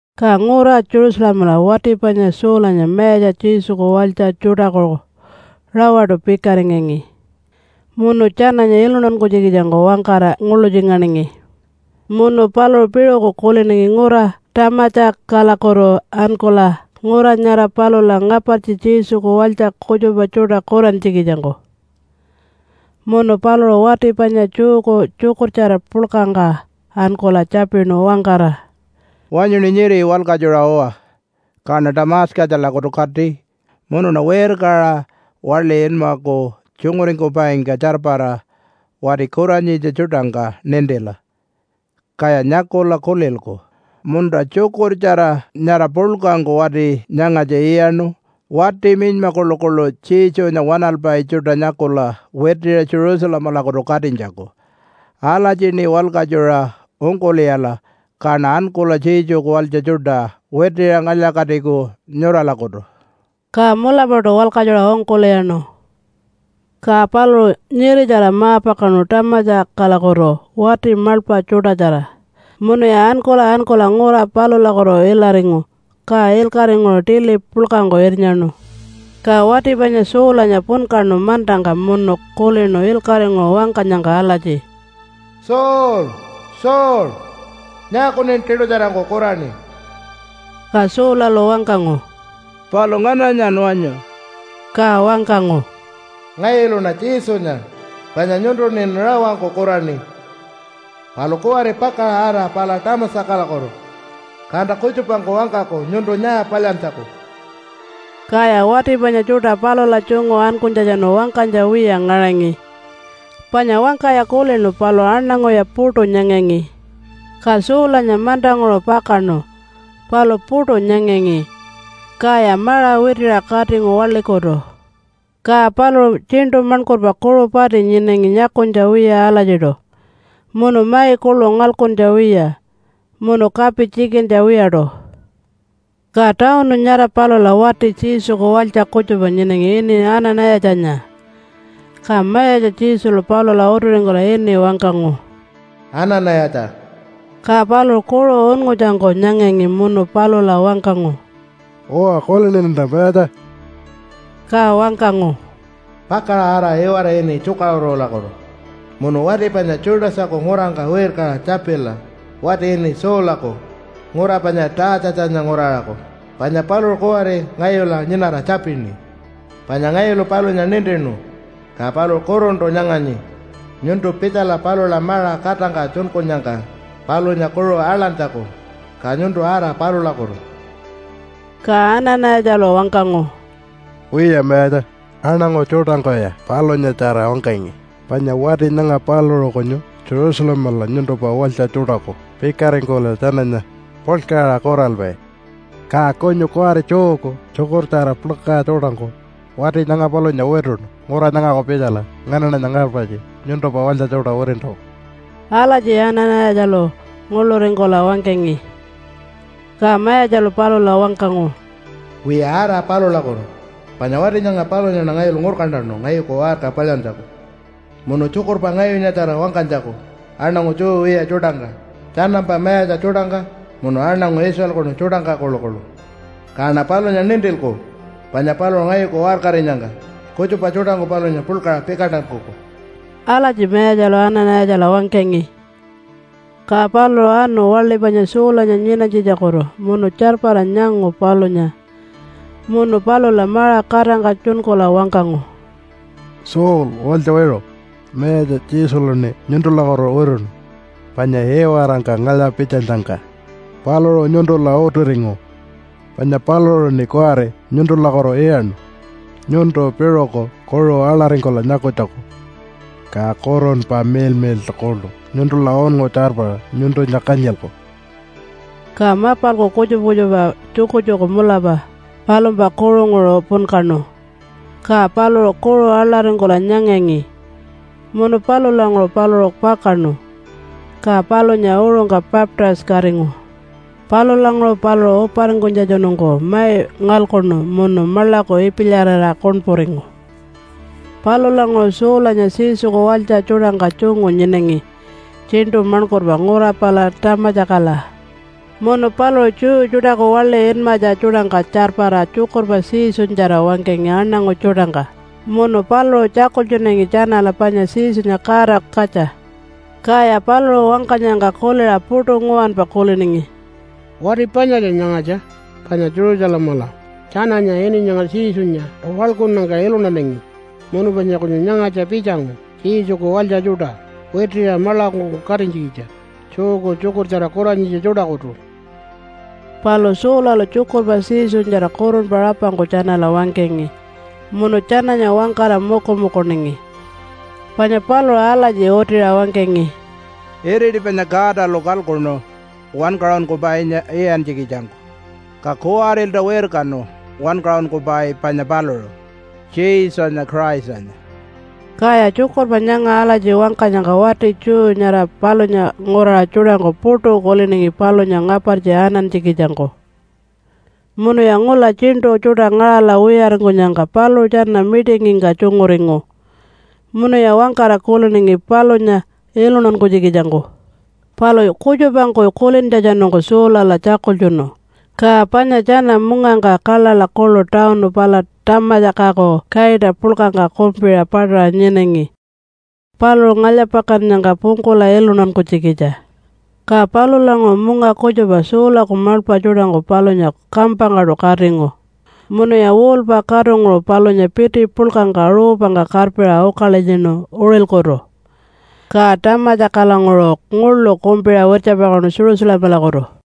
Ka ngura Jerusalemala wati panya Saulanya Mayatja Jesuku walytja tjuṯaku rawaṯu pikaringangi munu tjananya iluntankunytjikitjangku wangkara nguḻutjinganingi. Munu paluṟu piṟuku kuliningi ngura Tamatjakalakutu ankula ngura nyara palula ngapartji Jesuku walytja kutjupa tjuṯa kurantjikitjangku. Munu paluṟu wati panya Jewku tjukurtjara puḻkangka ankula tjapinu wangkara, “Wanyuṉi nyiri walkatjura uwa, kaṉa Tamatjakalakutu kati munuṉa wirkaṟa waḻi inmaku tjunguringkupaingka tjarpara wati kuranyitja tjuṯangka nintila, kaya nyakula kulilku, ‘Munta, tjukurtjara nyara puḻkangku wati nyangatja iyaṉu wati minyma kuḻukuḻu Jesunya waṉalpai tjuṯa nyakula witiṟa Jerusalemalakutu katinytjaku.’ Alatjiṉi walkatjuṟa ungkul'iyala, kaṉa ankula Jesuku walytja tjuṯa witiṟa ngalya-katiku nyuralakutu.” Ka mulapaṯu walkatjuṟa ungkul'iyaṉu. Ka paluṟu nyiritjara ma-pakaṉu Tamatjakalakutu wati maḻpa tjuṯatjara munuya ankula ankula ngura palulakutu ilaringu, ka ilkaṟinguṟu tili puḻkangku irnyaṉu. Ka wati panya Saulanya punkaṉu mantangka munu kulinu ilkaṟinguṟu wangkanyangka alatji, “Saul! Saul! Nyaakuṉin tiṯutjarangku kuraṉi?” Ka Saulalu wangkangu, “Palu ngananyan wanyu?” Ka wangkangu, “Ngayuluṉa Jesunya, panya nyuntuṉin rawangku kuraṉi. Palu kuwari pakaṟa ara pala Tamatjakalakutu, kanta kutjupangku wangkaku nyuntu nyaa palyantjaku.” Kaya wati panya tjuṯa palula tjungu ankunytjatjanu wangkanytja wiya ngaṟangi, panya wangkaya kulinu palu aṉanguya puṯu nyangangi. Ka Saulanya mantanguṟu pakaṉu, palu puṯu nyangangi, kaya maṟa witiṟa katingu waḻikutu. Ka paluṟu tjiṉṯu maṉkurpa kuṟu pati nyinangi nyakunytja wiya alatjiṯu munu mai kuḻu ngalkuntja wiya munu kapi tjikintja wiyaṯu. Ka tawunu nyara palula wati Jesuku walytja kutjupa nyinangi ini Ana-nayatjanya. Ka Mayatja Jesulu palula utiringkula ini wangkangu, “Ana-nayatja!” Ka paluṟu kuṟu unngutjangku nyangangi munu palula wangkangu, “Uwa, kuliniṉanta Mayatja.” Ka wangkangu, “Pakaṟa ara iwara ini ‘Tjukaṟurulakutu’ munu wati panya Judasaku ngurangka wirkaṟa tjapila wati ini Saulaku ngura panya Taatjatjanya nguraṟaku, panya paluṟu kuwari ngayula nyinara tjapini. Panya ngayulu palunya nintinu ka paluṟu kuruntu nyanganyi nyuntu pitjala palula maṟa katangka tjunkunyangka palunya kuṟu aḻantjaku. Ka nyuntu ara palulakutu!” Ka Ana-nayatjalu wangkangu, “Wiya Mayatja, aṉangu tjuṯangkuya palunyatjara wangkangi, panya wati nyanga paluṟu kunyu Jerusalemala nyuntumpa walytja tjuṯaku pikaringkula tjananya puḻkaṟa kuralpai. Ka kunyu kuwari Jewku tjukurtjara puḻka tjuṯangku wati nyanga palunya wituṉu ngura nyangaku pitjala nganaṉanya ngapartji nyuntumpa walytja tjuṯa witintjaku.” Alatji Ana-nayatjalu nguḻuringkula wangkangi. Ka Mayatjalu palula wangkangu, “Wiya, ara palulakutu! Panya wati nyanga palunyaṉa ngayulu ngurkantanu ngayuku waṟka palyantjaku munu tjukurpa ngayunyatjara wangkanytjaku aṉangu Jew wiya tjuṯangka, tjanampa mayatja tjuṯangka, munu aṉangu Israelkunu tjuṯangka kuḻukuḻu. Kaṉa palunya nintilku panya paluṟu ngayuku waṟkarinyangka kutjupa tjuṯangku palunya puḻkaṟa pikantankuku.” Alatji Mayatjalu Ana-nayatjala wangkangi. Ka paluṟu anu waḻi panya Saulanya nyinanytjitjakutu munu tjarpara nyangu palunya. Munu palula maṟa katangka tjunkula wangkangu, “Saul, walytja wiṟu! Mayatja Jesuluṉi nyuntulakutu wituṉu, panya iwarangka ngalya-pitjanyangka paluṟu nyuntula utiringu. Panya paluṟuṉi kuwari nyuntulakutu iyaṉu nyuntu piṟuku kuṟu aḻaringkula nyakunytjaku, ka Kurunpa Miḻmiḻṯu kuḻu nyuntula unngu tjarpara nyuntunya kanyilku.” Ka mapalku kutjupa kutjupa tjukutjuku mulapa palumpa kuṟunguṟu punkaṉu, ka paluṟu kuṟu aḻaringkula nyangangi. Munu palulanguṟu paluṟu pakaṉu, ka palunya uṟungka baptise-katingu. Palulanguṟu paluṟu uparingkunytjatjanungku mai ngalkuṉu munu maḻaku ipilyarira kuṉpuringu. Palulanguṟu Saulanya Jesuku walytja tjuṯangka tjungu nyinangi tjiṉṯu maṉkurpa ngura pala Tamatjakala. Munu paluṟu Jew tjuṯaku waḻi inmatja tjuṯangka tjarpara tjukurpa Jesunyatjara wangkangi aṉangu tjuṯangka. Munu paluṟu tjakultjunangi tjanala panya Jesunya Godaku katja. Kaya paluṟu wangkanyangka kuliṟa puṯu nguwanpa kuliningi, “Wati panyatja nyangatja, panya Jerusalemala tjananya ini nyanga Jesunya waḻkunnyangka iluntanangi. Munu panya kunyu nyangatja pitjangu Jesuku walytja tjuṯa witiṟa maḻakungku katinytjikitja Jewku tjukurtjara kuranyitja tjuṯakutu.” Palu Saulalu tjukurpa Jesunyatjara kurunpa rapangku tjanala wangkangi munu tjananya wangkara mukumukuningi. Panya paluṟu alatji utiṟa wangkangi, “Iriti panya Godalu kalkuṉu Wankaṟunkupainya iyantjikitjangku, ka kuwarilta wirkanu wankaṟunkupai panya paluṟu, Jesunya Christanya.” Kaya tjukurpa nyanga alatji wangkanyangka wati Jew nyara palunya nguraṟa tjuṯangku puṯu kuliningi palunya ngapartji anantjikitjangku. Munuya ngula tjiṉṯu tjuṯa ngaṟala wiyaringkunyangka paluṟu tjana mitingingka tjunguringu munuya wangkara kuliningi palunya iluntankunytjikitjangku. Palu kutjupangku kulintjatjanungku Saulala tjakultjunu. Ka panya tjana mungangka kaḻaḻa kuḻu tawunu pala Tamatjakaku kaita puḻkangka kumpiṟa paṯaṟa nyinangi paluṟu ngalya-pakannyangka pungkula iluntankunytjikitja. Ka palulanguṟu munga kutjupa Saulaku maḻpa tjuṯangku palunya kampangkaṯu katingu munuya wall-pa katunguṟu palunya piti puḻkangka ruupangka karpiṟa ukalilyinu uṟilkutu, ka Tamatjakalanguṟu nguḻu kumpiṟa wirtjapakaṉu Jerusalemalakutu.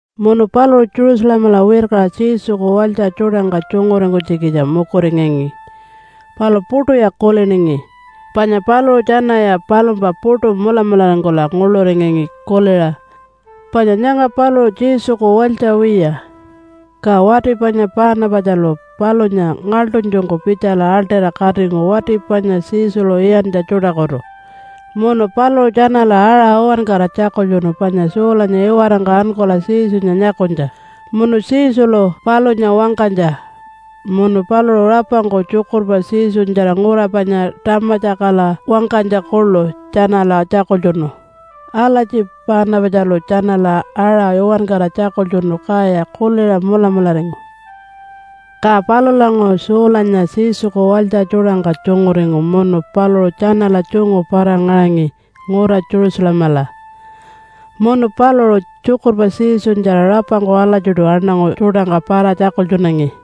Munu paluṟu Jerusalemala wirkaṟa Jesuku walytja tjuṯangka tjunguringkunytjikitja mukuringangi, palu puṯuya kuliningi, panya paluṟu tjanaya palumpa puṯu mulamularingkula nguḻuringangi kuliṟa, “Panya nyanga paluṟu Jesuku walytja wiya.” Ka wati panya Paanapatjalu palunya ngaḻṯunytjungku pitjala aḻṯira katingu wati panya Jesulu iyantja tjuṯakutu. Munu paluṟu tjanala aṟa uwankara tjakultjunu panya Saulanya iwarangka ankula Jesunya nyakunytja, munu Jesulu palunya wangkanytja, munu paluṟu rapangku tjukurpa Jesunyatjara ngura panya Tamatjakala wangkanytja kuḻu tjanala tjakultjunu. Alatji Paanapatjalu tjanala aṟa uwankara tjakultjunu, kaya kuliṟa mulamularingu. Ka palulanguṟu Saulanya Jesuku walytja tjuṯangka tjunguringu munu paluṟu tjanala tjungu para-ngaṟangi ngura Jerusalemala. Munu paluṟu tjukurpa Jesunyatjara rapangku alatjiṯu aṉangu tjuṯangka para-tjakultjunangi.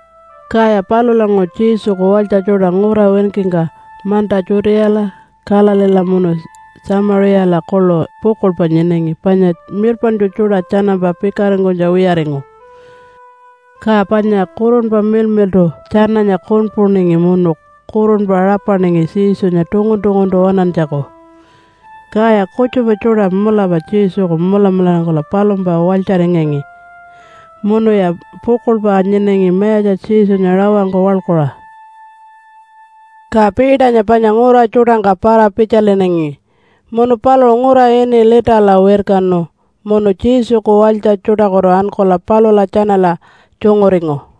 Kaya palulanguṟu Jesuku walytja tjuṯa ngura winkingka manta Judeala, Galileela munu Tjamiṟiyala kuḻu pukuḻpa nyinangi panya mirpaṉtju tjuṯa tjanampa pikaringkunytja wiyaringu. Ka panya Kurunpa Miḻmiḻṯu tjananya kuṉpuningi munu kurunpa rapaningi Jesunya tungun-tunguntu waṉantjaku. Kaya kutjupa tjuṯa mulapa Jesuku mulamularingkula palumpa walytjaringangi munuya pukuḻpa nyinangi Mayatja Jesunya rawangku waḻkuṟa. Ka Peternya panya ngura tjuṯangka para-pitjalinangi, munu paluṟu ngura ini Litala wirkanu munu Jesuku walytja tjuṯakutu ankula palula tjanala tjunguringu.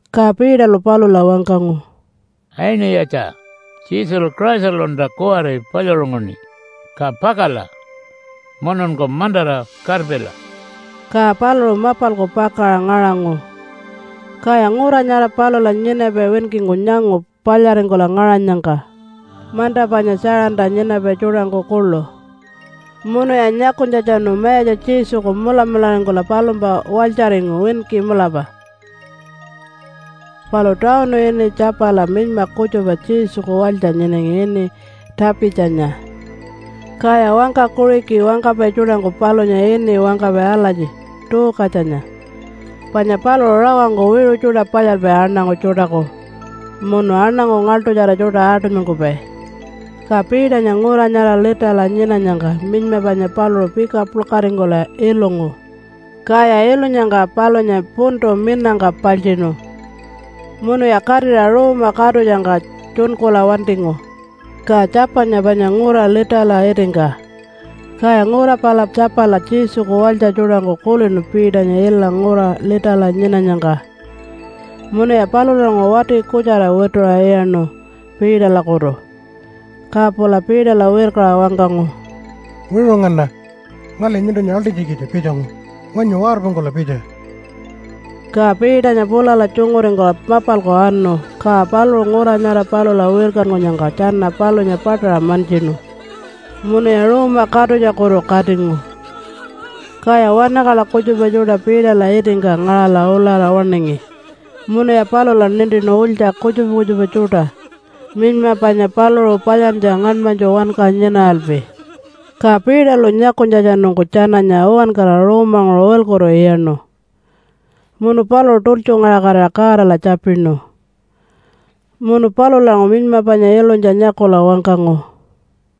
Ka Peterlu palula wangkangu, “Aini-yatja! Jesulu Christalunta kuwari palyaṟunguṉi, ka pakala mununku mantara karpila.” Ka paluṟu mapalku pakaṟa ngaṟangu. Kaya ngura nyara palula nyinapai winkingku nyangu palyaringkula ngaṟanyangka, manta panya Tjaṟanta nyinapai tjuṯangku kuḻu. Munuya nyakunytjatjanu Mayatja Jesuku mulamularingkula palumpa walytjaringu winki mulapa. Palu tawunu ini Tjapala minyma kutjupa Jesuku walytja nyinangi ini Tapitjanya. Kaya wangka Kuṟiki wangkapai tjuṯangku palunya ini wangkapai alatji Tuukatjanya. Panya paluṟu rawangku wiṟu tjuṯa palyalpai aṉangu tjuṯaku munu aṉangu ngaḻṯutjara tjuṯa aṯunymankupai. Ka Peternya ngura nyara Litala nyinanyangka minyma panya paluṟu pika puḻkaringkula ilungu. Kaya ilunyangka palunya puntu minangka paltjiṉu munuya katira ruuma katutjangka tjunkula wantingu. Ka Tjapanya panya ngura Litala itingka, kaya ngura pala Tjapala Jesuku walytja tjuṯangku kulinu Peternya ila ngura Litala nyinanyangka. Munuya palulanguṟu wati kutjara wituṟa iyaṉu Peterlakutu. Ka pula Peterla wirkaṟa wangkangu, “Wiṟu ngana, ngali nyuntunya aḻṯinytjikitja pitjangu. Wanyu warpungkula pitja!” Ka Peternya pulala tjunguringkula mapalku anu. Ka paluṟu ngura nyara palula wirkankunyangka tjana palunya paṯaṟa mantjinu munuya ruuma katutjakutu katingu. Kaya wanakaḻa kutjupa tjuṯa Peterla itingka ngaṟala ulara waṉingi, munuya palula nintinu ulytja kutjupa kutjupa tjuṯa minyma panya paluṟu palyantja ngaṉmanytju wanka nyinaralpi. Ka Peterlu nyakunytjatjanungku tjananya uwankara ruumanguṟu uṟilkutu iyaṉu. Munu paluṟu tultjungaṟakatira Godala tjapinu, munu palulanguṟu minyma panya ilunytja nyakula wangkangu,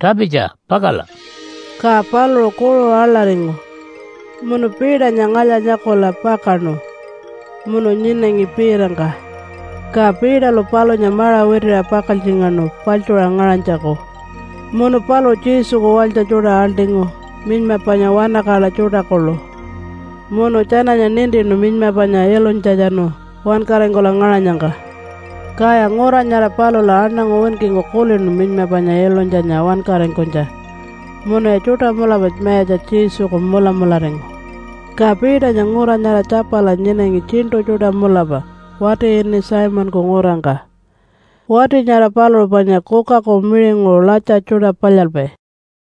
“Tapitja! Pakala!” Ka paluṟu kuṟu aḻaringu munu Peternya ngalya-nyakula pakaṉu munu nyinangi piitangka. Ka Peterlu palunya maṟa witiṟa pakaltjingaṉu paḻtjuṟa ngaṟanytjaku, munu paluṟu Jesuku walytja tjuṯa aḻṯingu minyma panya wanakaḻa tjuṯa kuḻu. Munu tjananya nintinu minyma panya ilunytjatjanu wankaringkula ngaṟanyangka. Kaya ngura nyara palula aṉangu winkingku kulinu minyma panya ilunytjanya wankaringkunytja, munuya tjuṯa mulapa Mayatja Jesuku mulamularingu. Ka Peternya ngura nyara Tjapala nyinangi tjiṉṯu tjuṯa mulapa wati ini Simonku ngurangka. Wati nyara paluṟu panya kukaku miṟinguṟu latja tjuṯa palyalpai.